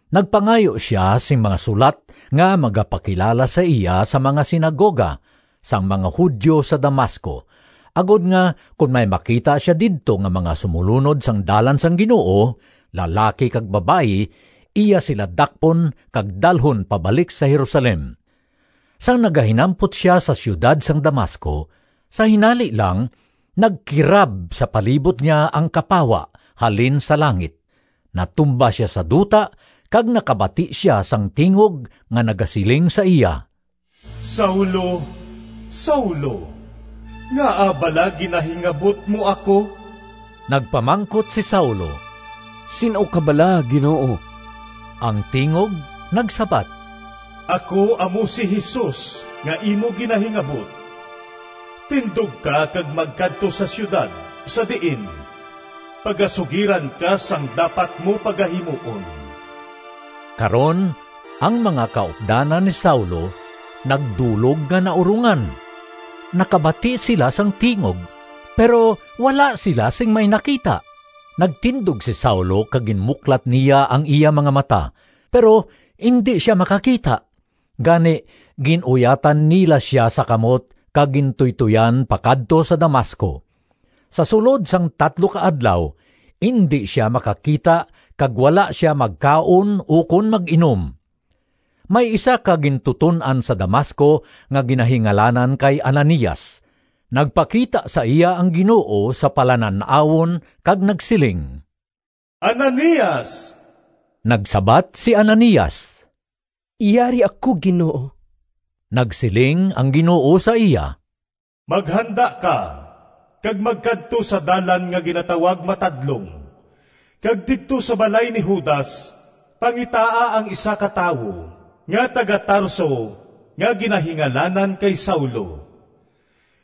Nagpangayo sia sing mga sulat nga magapakilala sa iya sa mga sinagoga sang mga Judio sa Damasco, agod nga kon may makita sia didto nga mga sumolunod sang Dalan sang Ginoo, lalaki kag babayi, iya sila dakpon kag dalhon pabalik sa Jerusalem. Sang nagahinampot sia sa siyudad sang Damasco, sa hinali lang nagkirab sa palibot niya ang kapawa halin sa langit. Natumba sia sa duta kag nakabati sia sang tingog nga nagasiling sa iya, “Saulo, Saulo! Ngaa bala ginahingabot mo ako?” Nagpamangkot si Saulo, “Sin-o ka bala, Ginoo?” Ang tingog nagsabat, “Ako amo si Jesus nga imo ginahingabot. Tindog ka kag magkadto sa siyudad sa diin pagasugiran ka sang dapat mo pagahimuon.” Karon ang mga kaupdanan ni Saulo nagdulog nga naurongan. Nakabati sila sang tingog, pero wala sila sing may nakita. Nagtindog si Saulo kag ginmuklat niya ang iya mga mata, pero indi sia makakita. Gani gin-uyatan nila sia sa kamot kag gintuytoyan pakadto sa Damasco. Sa sulod sang tatlo ka adlaw indi sia makakita kag wala sia magkaon ukon mag-inom. May isa ka gintuton-an sa Damasco nga ginahingalanan kay Ananias. Nagpakita sa iya ang Ginoo sa palanan-awon kag nagsiling, “Ananias!” Nagsabat si Ananias, “Yari ako, Ginoo.” Nagsiling ang Ginoo sa iya, “Maghanda ka kag magkadto sa dalan nga ginatawag Matadlong, kag didto sa balay ni Judas pangitaa ang isa ka tawo nga taga-Tarso nga ginahingalanan kay Saulo.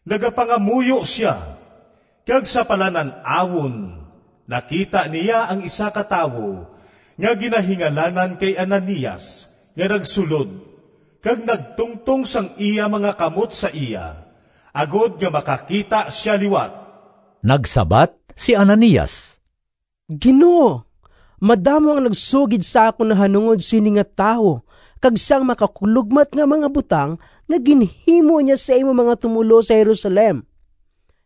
Nagapangamuyo sia, kag sa palanan-awon nakita niya ang isa ka tawo nga ginahingalanan kay Ananias nga nagsulod kag nagtungtong sang iya mga kamot sa iya, agod nga makakita sia liwat.” Nagsabat si Ananias, “Ginoo, madamo ang nagsugid sa akon nahanungod sini nga tawo kag sang makakulogmat nga mga butang nga ginhimo niya sa imo mga tumoluo sa Jerusalem.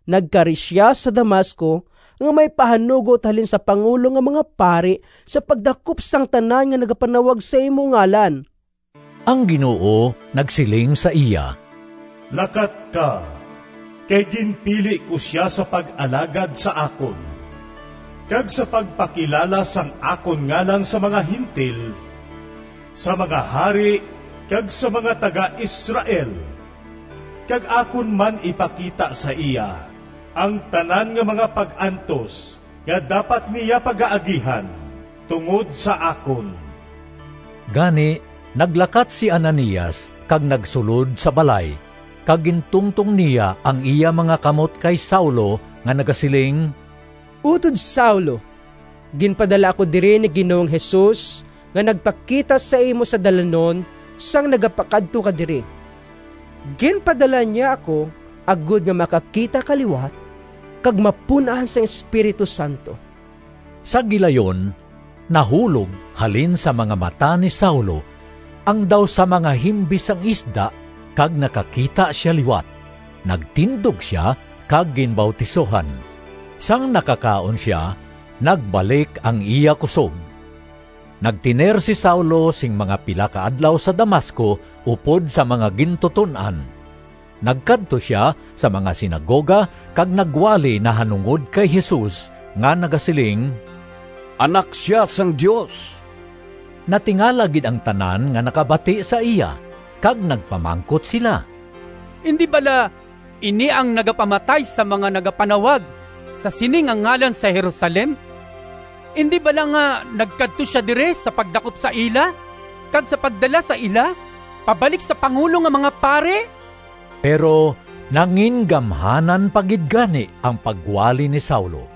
Nagkari sia sa Damasco nga may pahanugot halin sa pangulo nga mga pari sa pagdakop sang tanan nga nagapanawag sa imo ngalan.” Ang Ginoo nagsiling sa iya, “Lakat ka, kay ginpili ko sia sa pag-alagad sa akon, kag sa pagpakilala sang akon ngalan sa mga Gentil, sa mga hari kag sa mga taga-Israel. Kag akon man ipakita sa iya ang tanan nga mga pag-antos nga dapat niya pagaagihan tungod sa akon.” Gani, naglakat si Ananias kag nagsulod sa balay kag gintungtong niya ang iya mga kamot kay Saulo nga nagasiling, “Utod Saulo, ginpadala ako diri ni Ginoong Jesus nga nagpakita sa imo sa dalanon sang nagapakadto ka diri. Ginpadala niya ako agod nga makakita ka liwat kag mapun-an sang Espiritu Santo.” Sa gilayon nahulog halin sa mga mata ni Saulo ang daw sa mga himbis sang isda kag nakakita sia liwat. Nagtindog sia kag ginbautisohan. Sang nakakaon sia nagbalik ang iya kusog. Nagtener si Saulo sing mga pila ka adlaw sa Damasco upod sa mga gintuton-an. Nagkadto sia sa mga sinagoga kag nagwali nahanungod kay Jesus nga nagasiling, “Anak sia sang Dios.” Natingala gid ang tanan nga nakabati sa iya kag nagpamangkot sila, “Indi bala ini ang nagapamatay sang mga nagapanawag sa sini nga ngalan sa Jerusalem? Indi bala nga nagkadto sia diri sa pagdakop sa ila kag sa pagdala sa ila pabalik sa pangulo nga mga pari?” Pero nangingamhanan pa gid gani ang pagwali ni Saulo,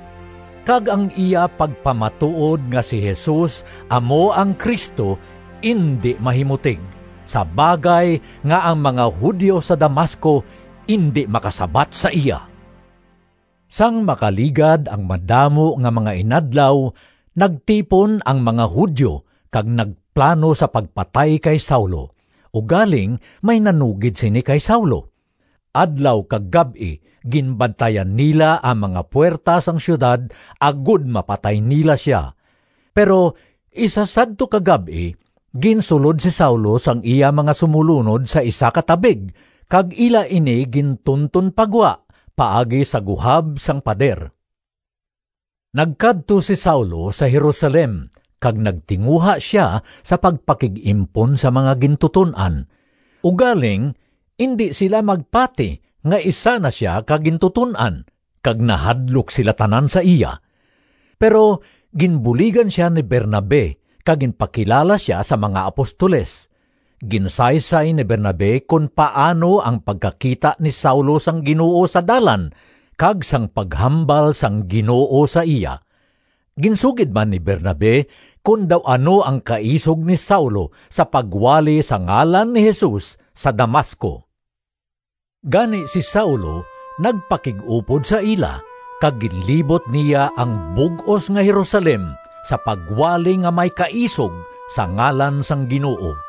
kag ang iya pagpamatuod nga si Jesus amo ang Cristo indi mahimutig, sa bagay nga ang mga Judio sa Damasco indi makasabat sa iya. Sang makaligad ang madamo nga mga inadlaw nagtipon ang mga Judio kag nagplano sa pagpatay kay Saulo, ugaling may nanugid sini kay Saulo. Adlaw kag gab-i ginbantayan nila ang mga puwerta sang siyudad agod mapatay nila sia. Pero isa sadto ka gab-i ginsulod si Saulo sang iya mga sumolunod sa isa ka tabig, kag ila ini gintunton pa gwa paagi sa guhab sang pader. Nagkadto si Saulo sa Jerusalem kag nagtinguha sia sa pagpakig-impon sa mga gintuton-an. Ugaling indi sila magpati nga isa na sia ka gintuton-an kag nahadlok sila tanan sa iya. Pero ginbuligan sia ni Bernabe kag ginpakilala sia sa mga apostoles. Ginsaysay ni Bernabe kon paano ang pagkakita ni Saulo sang Ginoo sa dalan kag sang paghambal sang Ginoo sa iya. Ginsugid man ni Bernabe kon daw ano ang kaisog ni Saulo sa pagwali sa ngalan ni Jesus sa Damasco. Gani si Saulo nagpakig-upod sa ila kag ginlibot niya ang bug-os nga Jerusalem sa pagwali nga may kaisog sa ngalan sang Ginoo.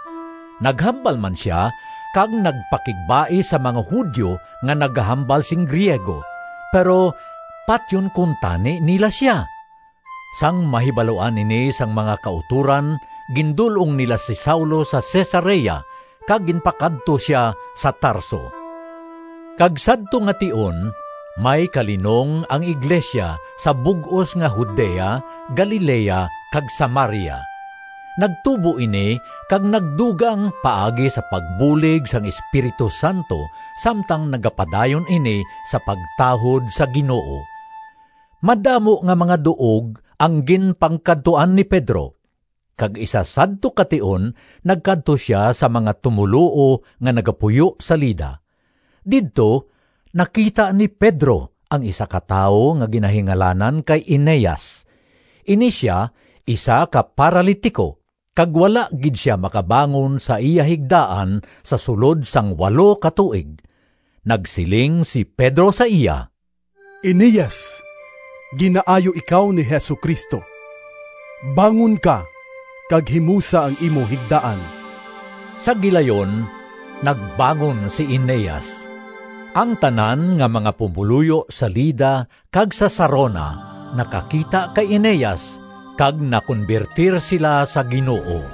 Naghambal man sia kag nagpakigbais sa mga Judio nga nagahambal sing Griego, pero patyon kuntani nila sia. Sang mahibaluan ini sang mga kautoran, gindul-ong nila si Saulo sa Cesarea kag ginpakadto sia sa Tarso. Kag sadto nga tion may kalinong ang iglesia sa bug-os nga Judea, Galilea kag Samaria. Nagtubo ini kag nagdugang paagi sa pagbulig sang Espiritu Santo samtang nagapadayon ini sa pagtahod sa Ginoo. Madamo nga mga duog ang ginpangkadtuan ni Pedro, kag isa sadto ka tion nagkadto sia sa mga tumoluo nga nagapuyo sa Lida. Didto nakita ni Pedro ang isa ka tawo nga ginahingalanan kay Eneas. Ini sia isa ka paralitiko kag wala gid sia makabangon sa iya higdaan sa sulod sang walo ka tuig. Nagsiling si Pedro sa iya, “Eneas, ginaayo ikaw ni Jesu-Cristo. Bangon ka kag himusa ang imo higdaan.” Sa gilayon nagbangon si Eneas. Ang tanan nga mga pumoluyo sa Lida kag sa Sarona nakakita kay Eneas, kag nakonbertir sila sa Ginoo.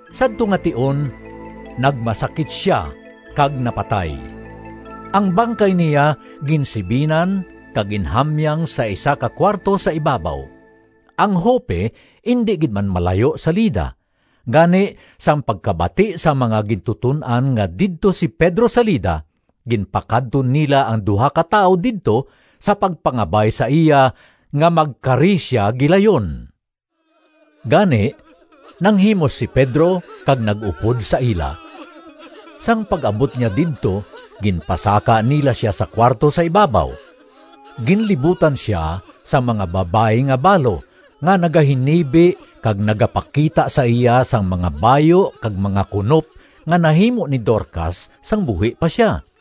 Sadto nga tion nagmasakit sia kag napatay. Ang bangkay niya ginsibinan kag ginhamyang sa isa ka kuwarto sa ibabaw. Ang Joppe indi gid man malayo sa Lida. Gani sang pagkabati sang mga gintuton-an nga didto si Pedro sa Lida, ginpakadto nila ang duha ka tawo didto sa pagpangabay sa iya nga magkari sia gilayon. Gani nanghimos si Pedro kag nag-upod sa ila. Sang pag-abot niya didto ginpasaka nila sia sa kuwarto sa ibabaw. Ginlibutan sia sang mga babayi nga balo nga nagahinibi kag nagapakita sa iya sang mga bayu kag mga kunop nga nahimo ni Dorcas sang buhi pa sia.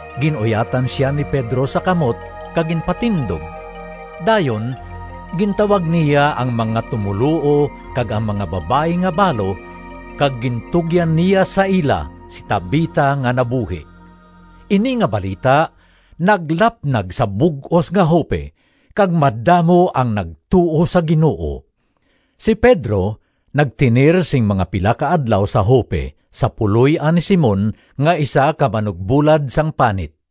Gin-uyatan sia ni Pedro sa kamot kag ginpatindog. Dayon gintawag niya ang mga tumoluo kag ang mga babayi nga balo kag gintugyan niya sa ila si Tabita nga nabuhi. Ini nga balita naglapnag sa bug-os nga Joppe kag madamo ang nagtuo sa Ginoo. Si Pedro nagtener sing mga pila ka adlaw sa Joppe sa puloy-an ni Simon nga isa ka manugbulad sang panit.